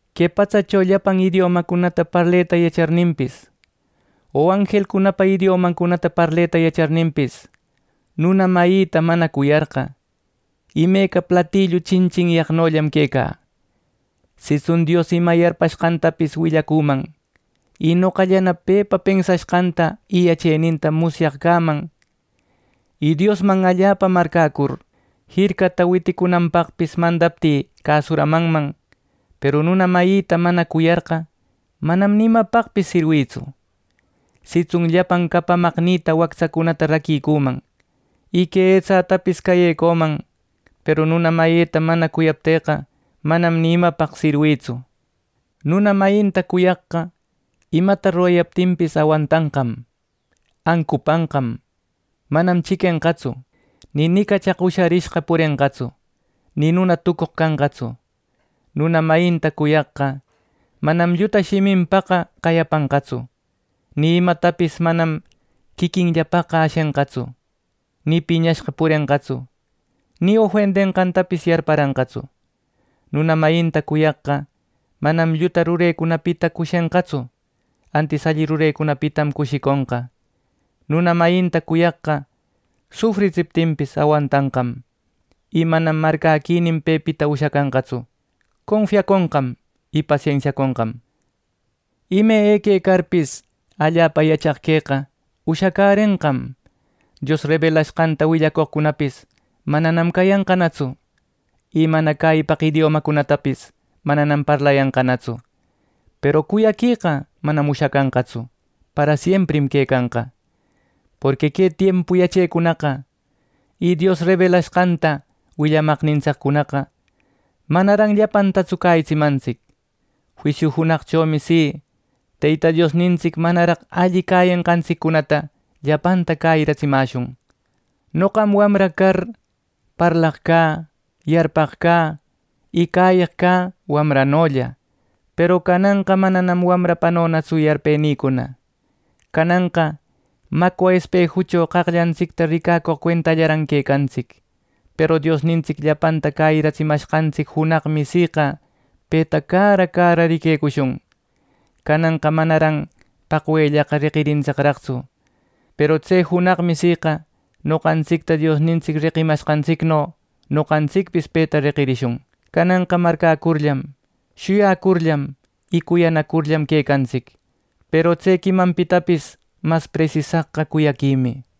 Que patsacho llapan idiomacunata parleta yacharninpis o anjelcunapa idiomancunata parleta yacharninpis, nuna mayïta mana cuyarqa, imeca platillu chinchinyaqnollam quecä. Sitsun Dios ima yarpashqantapis willacüman; y noqallana pepa pensashqanta y yacheninta musyaq cäman; y Diosman allapa marcäcur, jircata witicunanpaqpis mandaptï cäsuramanman, peru nuna mayita mana cuyarqa, manam ni imapaqpis sirwïtsu. Sitsun llapan capamaqnïta wactsacunata raquicüman, y que etsätapis cayëcüman, peru nuna mayïta mana cuyaptïqa, manam ni imapaq sirwïtsu. Nuna mayinta cuyaqqa imata rurayaptinpis, awantanqam, ancupanqam, manam chiquenqatsu, ni nicachaq usharishqa purenqatsu, ni nuna tucoq canqatsu. Nuna mayinta cuyaqqa manam lluta shiminpaqa qayapanqatsu, ni imatapis manam quiquinllapaqqa ashenqatsu, ni piñashqa purenqatsu, ni ofendenqantapis yarparanqatsu. Nuna mayinta cuyaqqa manam lluta rurecunapita cushenqatsu, antis alli rurecunapitam cushiconqa. Nuna mayinta cuyaqqa sufritsiptinpis awantanqam, y manam marcäquinin pepita ushacanqatsu, confiaconqam, y pasensiaconqam. Ime eque carpis, allapa yachaq queqa ushacärenqam, Dios rebelashqanta willacoqcunapis mananam cayanqanatsu, y mana cäyipaq idiomacunatapis mananam parlayanqanatsu; peru cuyaqueqa manam ushacanqatsu, parasiemprim quecanqa. Porqui que tiempu yachecunaqa y Dios rebelashqanta willamaqnintsiccunaqa manaran llapantatsu cäyitsimantsic. Juisiu junaqchomi si, Teyta Diosnintsic manaraq alli cäyenqantsiccunata llapanta cäyiratsimäshun. Noqam wamra car parlaq cä, yarpaq cä, y cäyeq cä wamranolla; peru cananqa manam wamrapanonatsu yarpenïcuna. Cananqa macwa espejucho qaqllantsicta ricacoq cuentallaran quecantsic, peru Diosnintsic llapanta cäyitsimanqantsic junaqmi siqa peta cara cara riquecushun. Cananqa manaran paqwellaqa reqintsicraqtsu; peru tse junaqmi siqa noqantsicta Diosnintsic reqimanqantsicno, noqantsicpis peta reqirishun. Cananqa marcäcurllam, shuyacurllam y cuyanacurllam quecantsic; peru tse quimanpitapis mas presisaqqa cuyaquimi.